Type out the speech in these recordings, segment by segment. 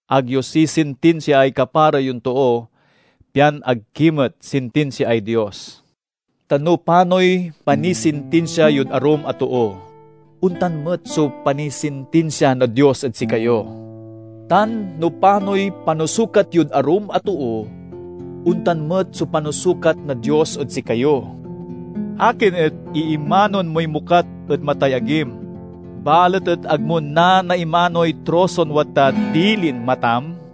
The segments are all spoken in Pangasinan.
"Ag yo sisintinsiaay kapara yon too, pian ag ki met sintinsiaay Dios. Ta no panoy panisintinsia yod arum a too, ontan met so panisintinsia na Dios ed sikayo; tan no panoy panusukat yod arum a too, ontan met so panusukat na Dios ed sikayo. Akin et iimanoen moy mokat ed matay agim, balet et ag mo nanaimanoy troson wadtad dilin matam?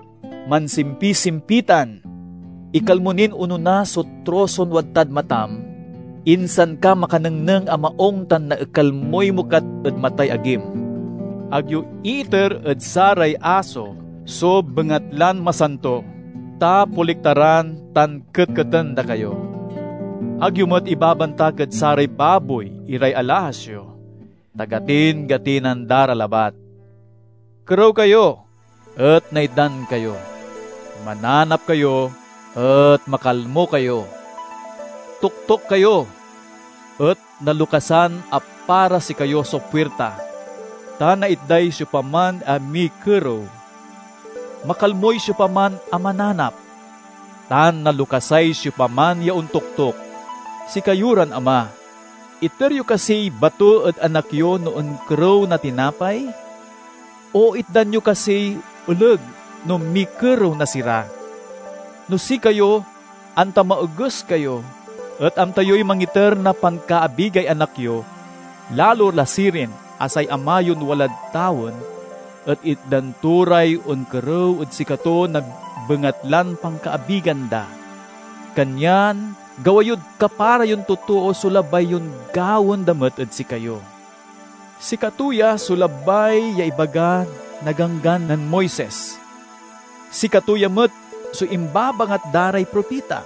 Mansimpisimpitan! Ekal mo nin onona so troson wadtad matam, insan ka makanengneng a maung tan naekal moy mokat ed matay agim. "Ag yo iiter ed saray aso so bengatlan masanto, ta poliktaran tan ketketen da kayo. Ag yo met ibabantak ed saray baboy iray alahas yo, ta gatingatinan da ra labat." "Kerew kayo, et naitdan kayo. Mananap kayo, et makalmo kayo. Toktok kayo, et nalokasan a para sikayo so puirta. Ta naitday siopaman a mikerew; makalmoy siopaman a mananap; tan nalokasay siopaman ya ontoktok. Sikayo ran ama, iter yo kasiy bato ed anak yo no onkerew na tinapay? O itdan yo kasiy oleg no mikerew na sira? No sikayo, anta maoges kayo, et amta yoy mangiter na pankaabigay anak yo, lalo la sirin a say Ama yon walad tawen et itdan to ray onkerew ed sikato na bengatlan pankaabigan da. "Kanyan gawa yod kapara yon totoo so labay yon gawaen da met ed sikayo. Sikato ya so labay ya ibaga na Ganggan nen Moises; sikato ya met so imbabangat da ray propita."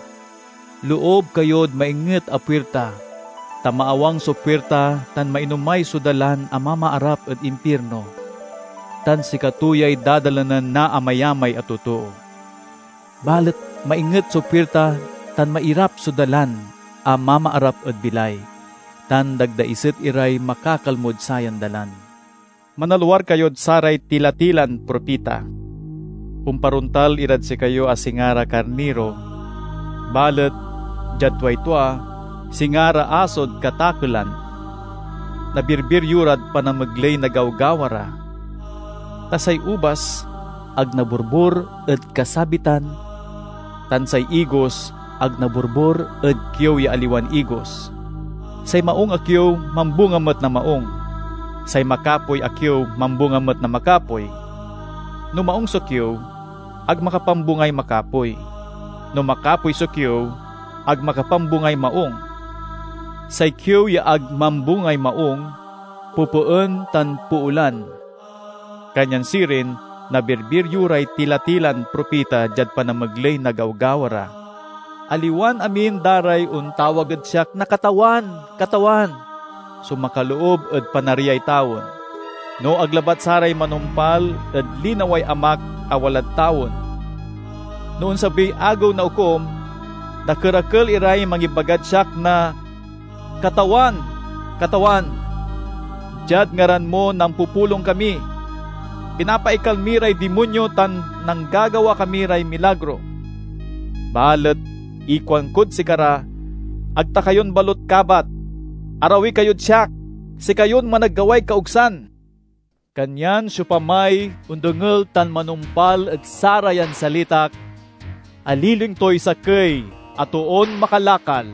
"Loob kayod mainget a puirta, ta maawang so puirta tan mainomay so dalan a mamaarap ed impirno, tan sikato yay dadalanen na amayamay a totoo. Balet mainget so puirta tan mairap so dalan a mamaarap ed bilay, tan dagdaiset iray makakalmod sayan dalan." "Manalwar kayod saray tila-tilan propita. Omparontal irad sikayo a singa ra karniro balet, diad tuay tua, singa ra asod katakelan. Nabirbir yo rad panamegley na gawgawa ra. Ta say ubas ag naborbor ed kasabitan, tan say igos ag naborbor ed kiew ya aliwan igos. Say maung a kiew mambunga met na maung; say makapoy a kiew mambunga met na makapoy. No maung so kiew, ag makapambungay makapoy; no makapoy so kiew, ag makapambungay maung. Say kiew ya ag mambungay maung, popoen tan poolan. Kanyan sirin, nabirbir yo ray tila-tilan propita diad panamegley na gawgawa ra." "Aliwan amin da ray ontawag ed siak na 'Katawan, Katawan,' so makaloob ed Panariay tawen, no ag labat saray manumpal ed linaway Amak a walad tawen. No onsabiy Agew na Okum, dakerakel iray mangibagad siak na: 'Katawan, Katawan! Diad ngaran mo nampupulong kami, pinapaekal mi ray dimonyo tan nanggagawa kami ray milagro!' Balet ikuankod sikara, 'Ag ta kayon balut kabat. Arawi kayod siak, sikayon managgaway kaosgan!'" "Kanyan siopamay ondengel tan manumpal ed sarayan salitak, aliling toy sakey a toon makalakal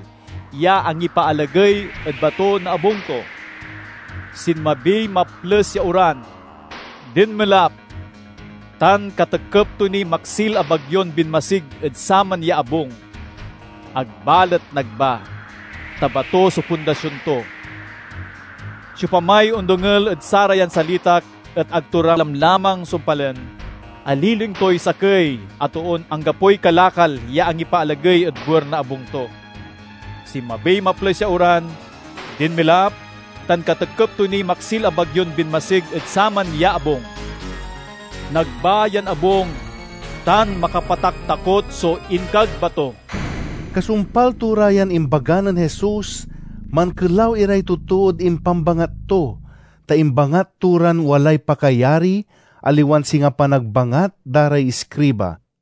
ya angipaalagey ed bato na abung to. Sinmabiy maples ya oran, dinmelap, tan katekep to niy maksil a bagyon binmasig ed saman ya abung. Ag balet nagba, ta bato so pundasion to. "Siopamay ondengel ed sarayan salitak et ag to ra lamlamang sumpalen, aliling toy sakey a toon anggapoy kalakal ya angipaalagey ed buer na abung to. Sinmabiy maples ya oran, dinmelap, tan katekep to niy maksil a bagyon binmasig ed saman ya abung. Nagba yan abung, tan makapataktakot so inkagba to!" Kasumpal to ra yan imbaga nen Jesus mankelaw iray totood impambangat to, ta imbangat to ran walay pakayari, aliwan singa panagbangat da ray iskriba.